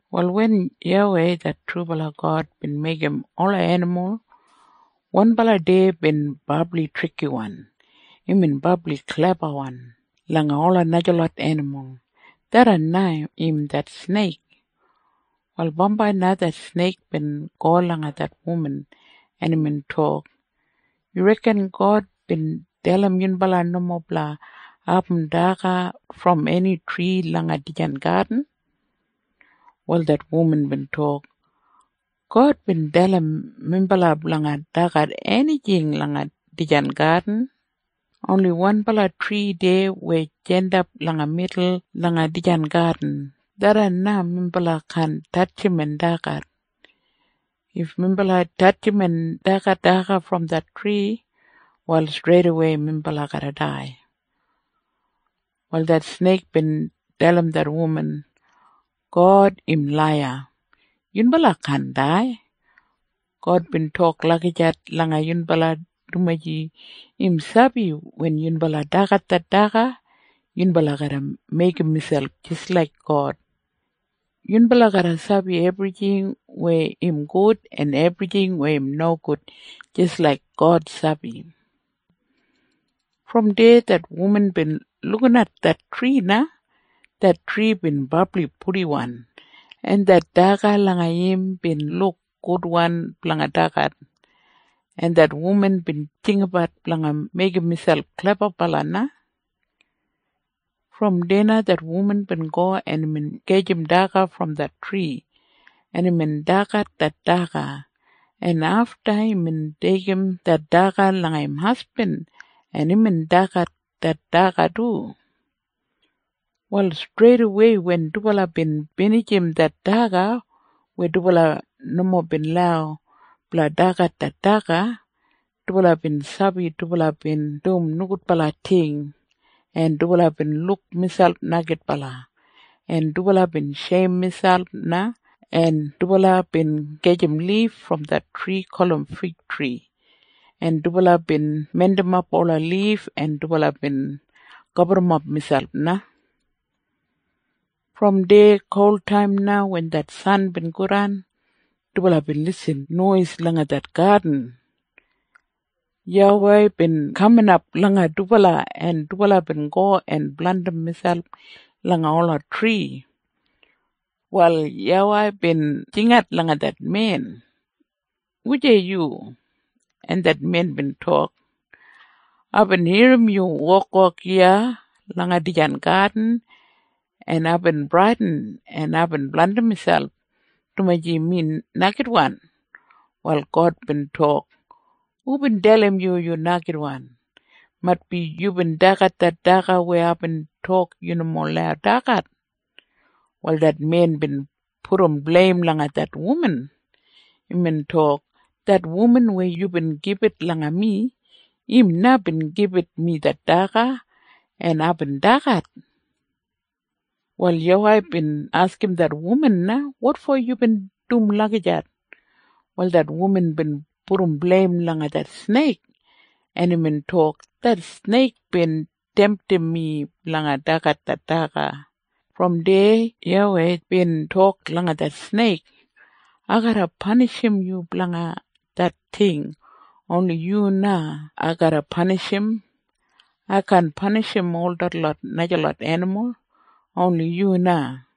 Wal wen YAWEI det trubala God bin meigim ola enimul, wanbala deya bin brabli trikiwan. Imbin brabli klebawan langa ola najalot enimul. Tharran na im det sneik. Wal bambai na det sneik bin go langa det wuman, en imbin tok, “Yu reken God bin dalim yunbala nomo blanga abum daga brom eni tri langa dijan gadin?” Wal det wuman bin tok, “God bin dalim minbala blanga dagat enijing langa dijan gadin. Oni wanbala tri deya weya jandap langa midul langa dijan gadin, tharran na minbala kaan tatjim en dagat. If minbala tatjim en dagat daga brom det tri, wal streidawei minbala garra dai.” Wal det sneik bin dalim det wuman, “God im laiya. Yunbala kaan dai. God bin tok lagijat langa yunbala dumaji im sabi wen yunbala dagat det daga, yunbala garra meigim miselp jis laik God. Yunbala garra sabi ebrijing weya im gud en ebrijing weya im nogud jis laik God sabi.” Brom deya det wuman bin lukinat det tri na. Det tri bin brabli purdiwan, en det daga langa im bin luk gudwan blanga dagat. En det wuman bin jinggabat blanga meigim miselp klebabala na. Brom deya det wuman bin go en imbin gajim daga brom det tri, en imbin dagat det daga, en afta imbin deigim det daga langa im hasbin, en imbin dagat det daga du. Wal streidawei wen dubala bin binijim det daga weya dubala nomo bin lau blanga dagat det daga, dubala bin sabi dubala bin dum nogudbala ting, en dubala bin luk miselp neigidbala, en dubala bin sheim miselp na en dubala bin gajim lif brom det tri gulum figtri, en dubala bin mindimap ola lif, en dubala bin gaburrumap miselp na. Brom deya kultaim na wen det san bin godan, dubala bin lisin nois langa det gadin. YAWEI bin kaminap langa dubala, en dubala bin go en blandim miselp langa ola tri. Wal YAWEI bin jingat langa det men, “Wujei yu?” En det men bin tok, “Aibin irrim yu wokwok iya langa dijan gadin, en aibin bradin, en aibin blandim miselp, dumaji mi neigidwan.” Wal God bin tok, “Hubin dalim yu, yu neigidwan? Maitbi yubin dagat det daga weya aibin tok yu nomo lau dagat.” Wal det men bin pudum bleim langa det wuman. Imbin tok, “Det wuman weya yubin gibit langa mi, im na bin gibit mi det daga, en aibin dagat.” Wal YAWEI bin askim det wuman na, “Wotfo yubin dum lagijat?” Wal det wuman bin pudum bleim langa det sneik. Imbin tok, “Det sneik bin temtim mi blanga dagat det daga.” Brom deya YAWEI bin tok langa det sneik, “Ai garra panishim yu blanga det ting. Oni yu na ai garra panishim. Ai kaan panishim ol detlot najalot enimul. Oni yu na.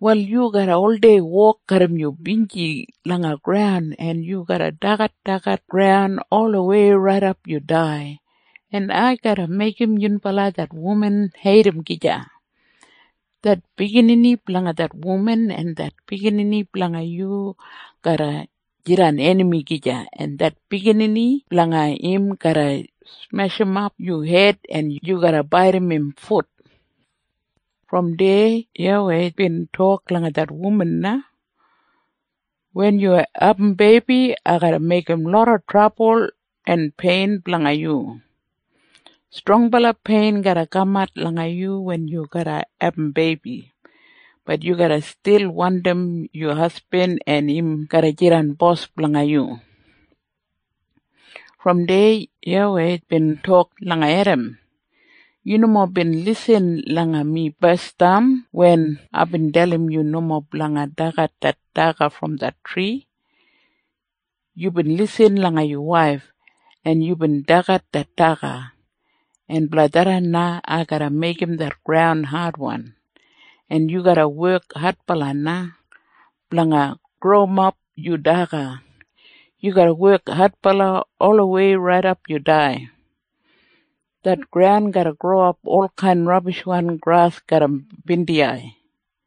Wal yu garra oldei wok garram yu binji langa graun, en yu garra dagadagat graun olawei raidap yu dai. En ai garra meigim yunbala det wuman heidim gija. Det biginini blanga det wuman en det biginini blanga yu garra jidan enami gija. En det biginini blanga im garra smeshimap yu hed, en yu garra baidim im fut.” Brom deya YAWEI bin tok langa det wuman na, “Wen yu abum beibi, ai garra meigim loda trabul en pein blanga yu. Strongbala pein garra kamat langa yu wen yu garra abum beibi. Bat yu garra stil wandim yu hasbin, en im garra jidan bos blanga yu.” Brom deya YAWEI bin tok langa Edam, “Yu nomo bin lisin langa mi basdam wen aibin dalim yu nomo blanga dagat det daga brom det tri. Yubin lisin langa yu waif, en yubin dagat det daga. En blanga tharran na ai garra meigim det graun adwan, en yu garra wek adbala na blanga growimap yu daga. Yu garra wek adbala olawei raidap yu dai. Det graun garra growimap olkain rabishwan gras garram bindiyai.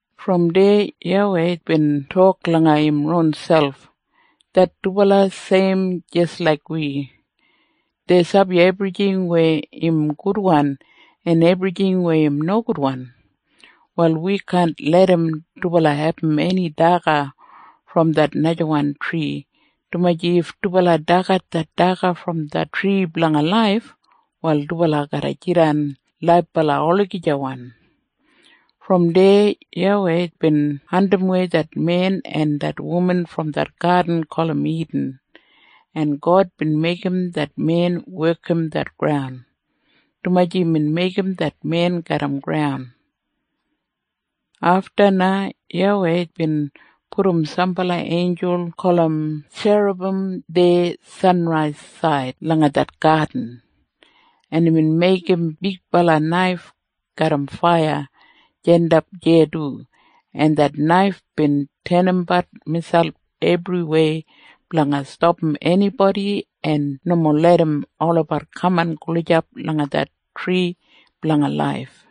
Brom deya YAWEI bin tok langa im ronselp, “Det dubala seim jis laik wi. Dei sabi ebrijing weya im gudwan en ebrijing weya im nogudwan. Wal wi kaan larram dubala abum eni daga brom det najawan tri, dumaji if dubala dagat det daga brom det Tri Blanga Laif, wal dubala garra jidan laibala olagijawan.” Brom deya YAWEI bin andimwei det men en det wuman brom det gadin gulum Idin, en God bin meigim det men wekim det graun, dumaji imbin meigim det men garram graun. Afta na YAWEI bin pudum sambala einjul gulum tjerabim deya sanraisaid langa det gadin, en imbin meigim bigbala naif garram faiya jandap deya du, en det naif bin tenimbat miselp ebriwei blanga stapam enibodi en nomo larram olabat kaman gulijap langa det Tri Blanga Laif.